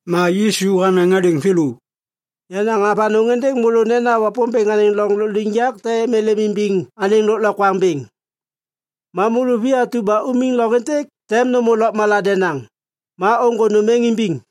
Ma Yisu hanaŋ hadêŋ thêlô, “Yanaŋ avanôŋ êndêŋ môlô nena Wapômbêŋ anêŋ loŋ lôkliŋyak tem êlêm imbiŋ anêŋ lôklokwaŋ bêŋ. Ma môlô vi atu ba umiŋ loŋ êntêk tem nômô lôkmala denaŋ, ma ôŋgô nôm êŋ imbiŋ.”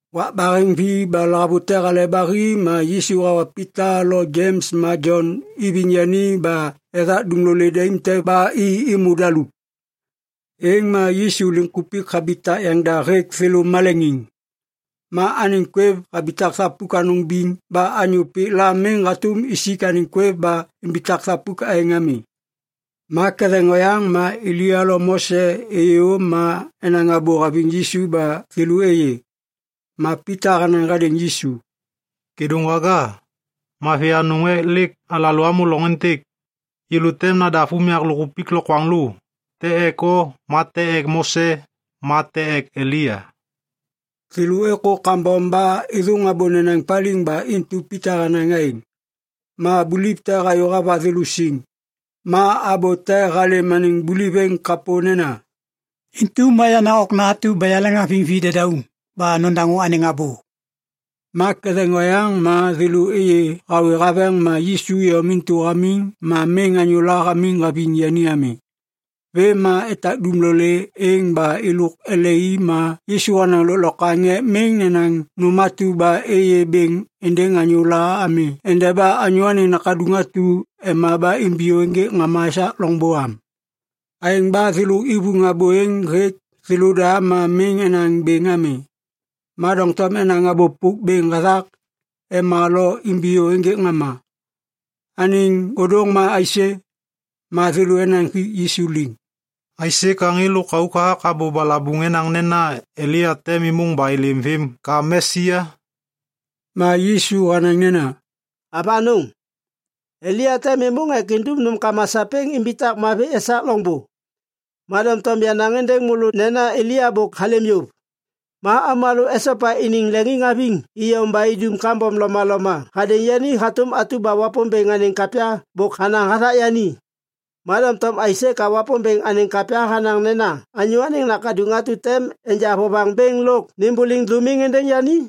Wak baheŋvi ba lahavute hale ba hi ma Yisu hawa Pita lo Jems ma Jon iviŋ yani ba ethak dumlolê daim te ba i êmô daluk. Êŋ ma Yisu liŋkupik habitak yaŋda hêk thêlô maleŋiŋ. Ma anêŋ kwêv habitak thapuk anôŋ biŋ ba anyô pik la miŋ hatôm isik anêŋ kwêv ba imbitak thapuk aêŋ ami. Ma ketheŋ oyaŋ ma Elia lo Mose êyô ma enaŋ abô haviŋ Yisu ba thêlô êyê. Ma Pita hanaŋ hadêŋ Yisu, “Kêdôŋwaga, mavi anôŋ ek lêk alalô amô loŋ êntêk. Yêlô tem nadav unyak lôkkupik lokwaŋlô, te ek o ma te ek Mose ma te ek Elia.” (Thêlô êkô kambom ba êthôŋ abô nenaŋ paliŋ ba intu Pita hanaŋ aêŋ.) Ma buliv te hayô hava thêlô siŋ, ma abô te halêm anêŋ buliv êŋ kapô nena, “Intu ma yenaŋ Okna atu ba yaleŋhaviŋ videdauŋ. Ba nodaŋô anêŋ abô!” Ma ketheŋ oyaŋ ma thêlô êyê hawê haveŋ ma Yisu iyom intu hamiŋ ma miŋ anyôla hamiŋ haviŋ yani ami. Vêm ma etak dumlolê êŋ ba êlôk ele i ma Yisu hanaŋ lôklokwaŋ ek miŋ nenaŋ nôm atu ba êyê bêŋ êndêŋ anyôla ami endeba Anyô Anêŋ Nakaduŋ atu ema ba imbiyô ênjêk ŋama esak loŋbô am. Aêŋ ba thêlô ivuŋ abô êŋ hêk thêlôda ma miŋ enaŋ bêŋ ami, ma doŋtom enaŋ abô pôk bêŋ hathak “ema lo imbiyô ênjêk ŋama” anêŋ ôdôŋ ma aisê? Ma thêlô enaŋ hik Yisu liŋ, “Aisê ka ŋê lôkauk hathak abô balabuŋ enaŋ nena Elia tem êmôŋ ba êlêm vêm ka Mesia?” Ma Yisu hanaŋ nena, “Avanôŋ! Elia tem êmôŋ ek indum nômkama sapêŋ imbitak mavi esak loŋbô. Ma doŋtom yanaŋ êndêŋ môlô nena Elia bôk halêm yôv. Ma avômalô esopa iniŋ leŋiŋhaviŋ iyom ba idum kambom lomaloma hadêŋ yani hatôm atu ba Wapômbêŋ anêŋ kapya bôk hanaŋ hathak yani. Ma doŋtom aisê ka Wapômbêŋ anêŋ kapya hanaŋ nena Anyô Anêŋ Nakaduŋ atu tem enja vovaŋ bêŋ lôk nêmbôliŋ dômiŋ êndêŋ yani?”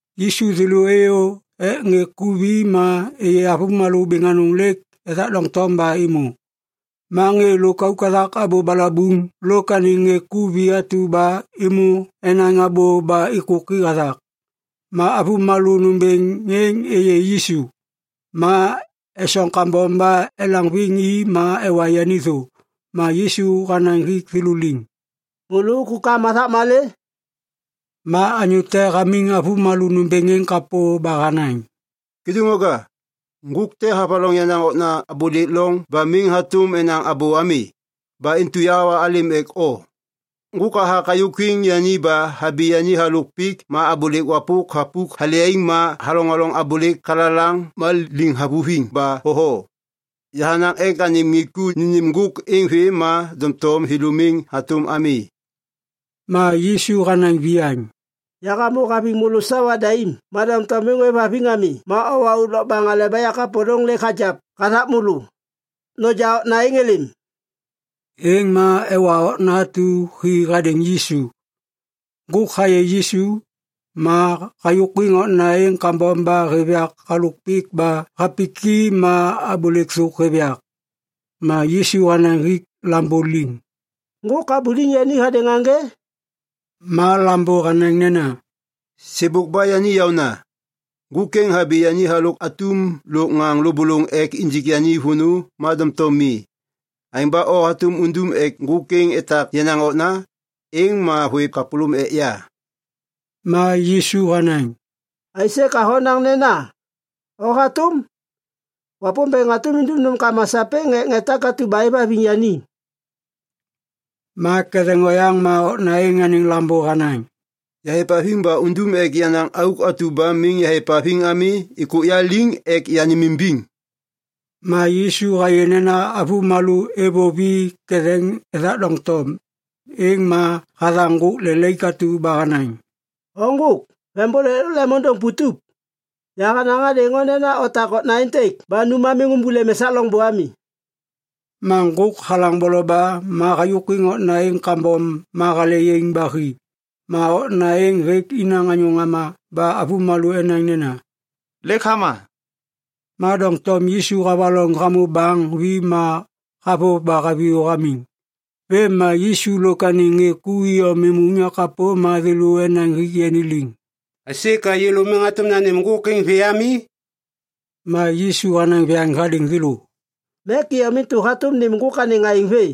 Yisu thêlô êyô ek ŋê ku vi ma êyê avômalô bêŋ anôŋ lêk ethak doŋtom ba êmô. Ma ŋê lôkauk hathak abô balabuŋ lôk anêŋ ŋê ku vi atu ba êmô enaŋ abô ba êkôki hathak. Ma avômalô nômbêŋ êŋ êyê Yisu, ma esoŋ kambom ba elaŋviŋ i ma ewa yani thô. Ma Yisu hanaŋ hik thêlô liŋ, “Môlô ôkôkam hathak malê?” Ma anyô te hamiŋ avômalô nômbêŋ êŋ kapô ba hanaŋ, “Kêdôŋwaga, ŋgôk te havaloŋ yenaŋ okna abôlêk loŋ ba miŋ hatôm enaŋ abô ami. Ba intu yahawa halêm ek o. Ŋgôk hathak hayôkwiŋ yani ba habi yani halôk pik ma abôlêk wapôk thapuk hale yaiŋ ma haloŋoloŋ abôlêk kalalaŋ ma liŋ havuviŋ ba thotho. Yahanaŋ ek anêm ŋê ku nênêm ŋgôk êŋ vê ma doŋtom thêlô miŋ hatôm ami.” Ma Yisu hanaŋ viyaŋ, “Yahamô haviŋ môlô sawa daim ma doŋtom miŋ ôêvhaviŋ ami ma owa auk lokbaŋ aleba yakapôlôŋ lêk hagiap hathak môlô. Noja okna êŋ êlêm.” Êŋ ma ewa okna atu hi hadêŋ Yisu. Ŋgôk hayê Yisu, ma hayôkwiŋ okna êŋ kambom ba hêv yak halôk pik ba hapiki ma abôlêk thôk hêv yak. Ma Yisu hanaŋ hik lambô liŋ, “Ŋgôk habuliŋ yani hadêŋ aŋgê?” Ma lambô hanaŋ nena, “Sêbôk ba yani yaôna. Ŋgôk êŋ habi yani halôk atum lôk ŋaŋ lôbôlôŋ ek injik yani vônô ma doŋtom mi. Aêŋ ba o hatôm undum ek ŋgôk êŋ etak yenaŋ okna, êŋ ma hôêv kapôlôm ek yai.” Ma Yisu hanaŋ, “Aisê ka honaŋ nena, ‘o hatôm’? Wapômbêŋ hatôm indum nômkama sapêŋ ek ŋê takatu ba êvhaviŋ yani.” Ma ketheŋ oyaŋ ma okna êŋ anêŋ lambô hanaŋ, “Yahêvhaviŋ ba undum ek yenaŋ auk atu ba miŋ yahêvhaviŋ ami êkôk ya liŋ ek yanêmimbiŋ!” Ma Yisu hayê nena avômalô êvôv i ketheŋ ethak doŋtom, êŋ ma hathaŋ ŋgôk lelaik atu ba hanaŋ, “O ŋgôk vembôlêk lôk lemôndôŋ putup, yahanaŋ hadêŋ o nena otak okna êntêk ba nu ma miŋ ômbôlêm esak loŋbô ami.” Ma ŋgôk halaŋ boloba ma hayôkwiŋ okna êŋ kambom ma hale yaiŋ ba hi. Ma okna êŋ hêk inaŋ anyô ŋama ba avômalô enaŋ nena, “Lêk hama.” Ma doŋtom Yisu havaloŋ hamô baŋ vi ma havôv ba haviyô hamiŋ. Vêm ma Yisu lôk anêŋ ŋê ku iyom êmô unyak kapô ma thêlô enaŋ hik yani liŋ, “Aisê ka yêlô miŋ hatôm nanêm ŋgôk êŋ vê ami?” Ma Yisu hanaŋ viyaŋ hadêŋ thêlô, “Mek iyom intu hatôm nêm ŋgôk anêŋ aêŋ vê.”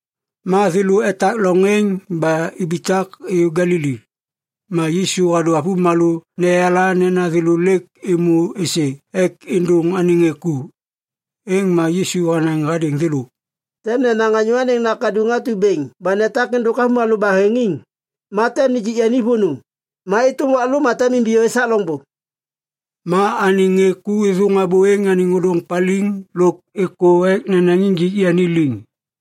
Ma thêlô etak loŋ êŋ ba ibitak êyô Galili. Ma Yisu hadô avômalô neyala nena thêlô lêk êmô êsê ek êndôŋ anêŋ ŋê ku. Êŋ ma Yisu hanaŋ hadêŋ thêlô, “Tem nenaŋ Anyô Anêŋ Nakaduŋ atu bêŋ ba netak êndôk avômalô baheŋiŋ. Ma tem nijik yani vônô, ma êtôm wak lô ma tem imbiyô esak loŋbô.” Ma anêŋ ŋê ku êthôŋ abô êŋ anêŋ ôdôŋ paliŋ lôk êkô ek nenaŋ injik yani liŋ.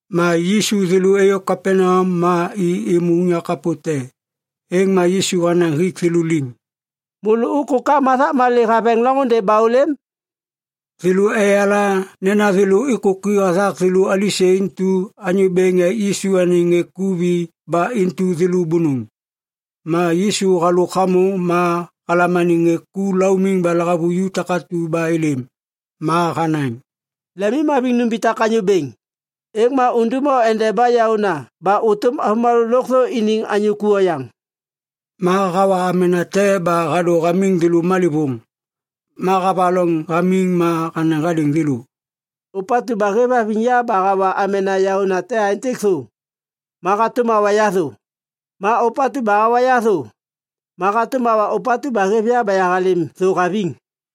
Ma Yisu thêlô êyô Kapaneam ma i êmô unyak kapô te. Êŋ ma Yisu hanaŋ hik thêlô liŋ, “Môlô ôkôkam hathak malê haveŋ loŋôndê ba ôlêm?” Thêlô eyala nena thêlô êkôki hathak thêlô alisê intu anyô bêŋ ek Yisu anêŋ ŋê ku vi ba intu thêlô bônôŋ. Ma Yisu halôk hamô ma halam anêŋ ŋê ku laumiŋ ba lahavuju takatu ba êlêm. Ma hanaŋ, “Lemimhaviŋ numbitak anyô bêŋ, êŋ ma undum o endeba yaôna ba ôtôm avômalô lôkthô iniŋ anyô ku oyaŋ.” Ma hawa amena te ba hadô hamiŋ thêlô malêvôŋ. Ma havaloŋ hamiŋ ma hanaŋ hadêŋ thêlô, “Ôpatu ba hêvhaviŋ ya ba hawa amena yaônate aêntêk thô, ma hatôm hawa ya thô. Ma ôpatu ba hawa ya thô, ma hatôm hawa ôpatu ba hêv ya ba yahalêm thô haviŋ.”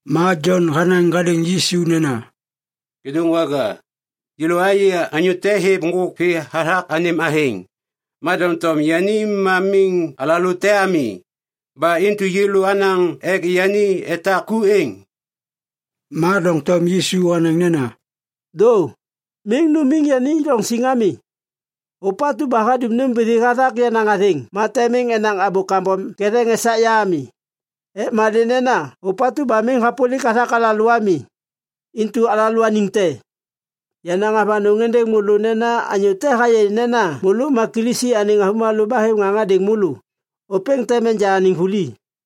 Ma Jon hanaŋ hadêŋ Yisu nena, “Kêdôŋwaga, yêlô ayê anyô te hêv ŋgôk vê hathak anêm athêŋ. Ma doŋtom yani ma miŋ alalô te ami, ba intu yêlô anaŋ ek yani etak ku êŋ.” Ma doŋtom Yisu hanaŋ nena, “Dô! Miŋ numiŋ yani loŋ siŋ ami. Ôpatu ba hadum nômbithi hathak yenaŋ athêŋ ma tem miŋ enaŋ abô kambom ketheŋ esak ya ami, ek malê nena ôpatu ba miŋ hapôlik hathak alalô ami, intu alalôaniŋ te. Yanaŋ avanôŋ êndêŋ môlô nena anyô te hayê nena môlô ma Kilisi anêŋ avômalô ba hêv ŋaŋ hadêŋ môlô, ôpêŋ tem enja anêŋ vuli.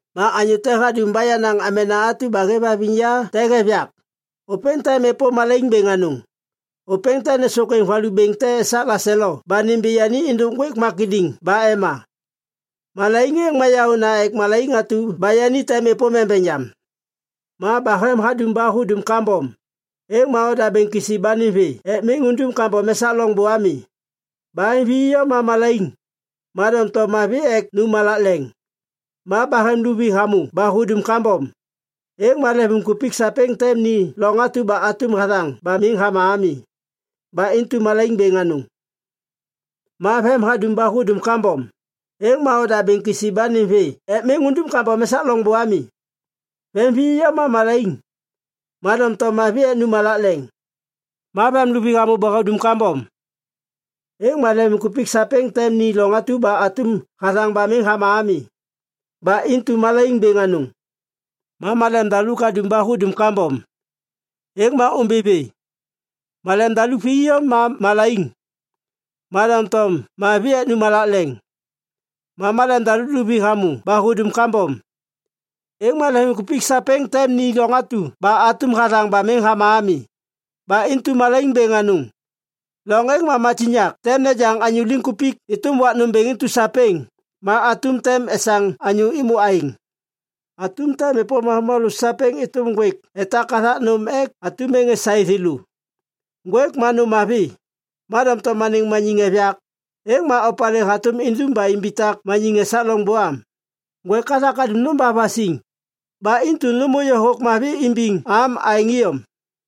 “Ma anyô te hadum ba yenaŋ amena atu ba hêvhaviŋ ya te hêv yak, ôpêŋ tem êpôm malaiŋ bêŋ anôŋ. Ôpêŋ tem nêsôkwêŋ valu bêŋ te esak laselo ba nimbi yani êndôk ŋgwêk makidiŋ ba ema. Malaiŋ êŋ ma yaôna ek malaiŋ atu ba yani tem êpôm embeŋ yam. Ma bahem hadum ba hudum kambom, êŋ ma odabêŋ kisi ba nêm vê ek miŋ undum kambom esak loŋbô ami! Bahem vi iyom ma malaiŋ, ma doŋtom mavi ek nu malak leŋ. Ma bahem luvi hamô ba hudum kambom, êŋ ma lemvimkupik sapêŋ tem ni loŋ atu ba atum hathaŋ ba miŋ hama ami. Ba intu malaiŋ bêŋ anôŋ. Ma vem hadum ba hudum kambom, êŋ ma odabêŋ kisi ba nêm vê ek miŋ undum kambom esak loŋbô ami! Vem vi iyom ma malaiŋ, ma doŋtom mavi ek nu malak leŋ. Ma vem luvi hamô ba hudum kambom, êŋ ma lemvimkupik sapêŋ tem ni loŋ atu ba atum hathaŋ ba miŋ hama ami. Ba intu malaiŋ bêŋ anôŋ. Ma malem daluk hadum ba hudum kambom, êŋ ma ômbi vê. Malem daluk vi iyom ma malaiŋ, ma doŋtom mavi ek nu malak leŋ. Ma malem daluk luvi hamô ba hudum kambom, êŋ ma lemvimkupik sapêŋ tem ni loŋ atu ba atum hathaŋ ba miŋ hama ami. Ba intu malaiŋ bêŋ anôŋ. ‘Loŋ êŋ ma matiŋyak tem nejaŋ anyô liŋkupik êtôm wak nômbêŋ intu sapêŋ, ma atum tem esaŋ anyô êmô aêŋ.’ Atum tem êpôm avômalô sapêŋ êtôm ŋgwêk etak hathak nôm ek atum êŋ esaê thêlô. “Ŋgwêk ma nôm mavi, ma doŋtom anêŋ maniŋ hêv yak, êŋ ma opalê hatôm idum ba imbitak maniŋ esak loŋbô am? Ŋgwêk hathak hadum nôm ba vasiŋ, ba intu nômô yôhôk mavi imbiŋ am aêŋ iyom.”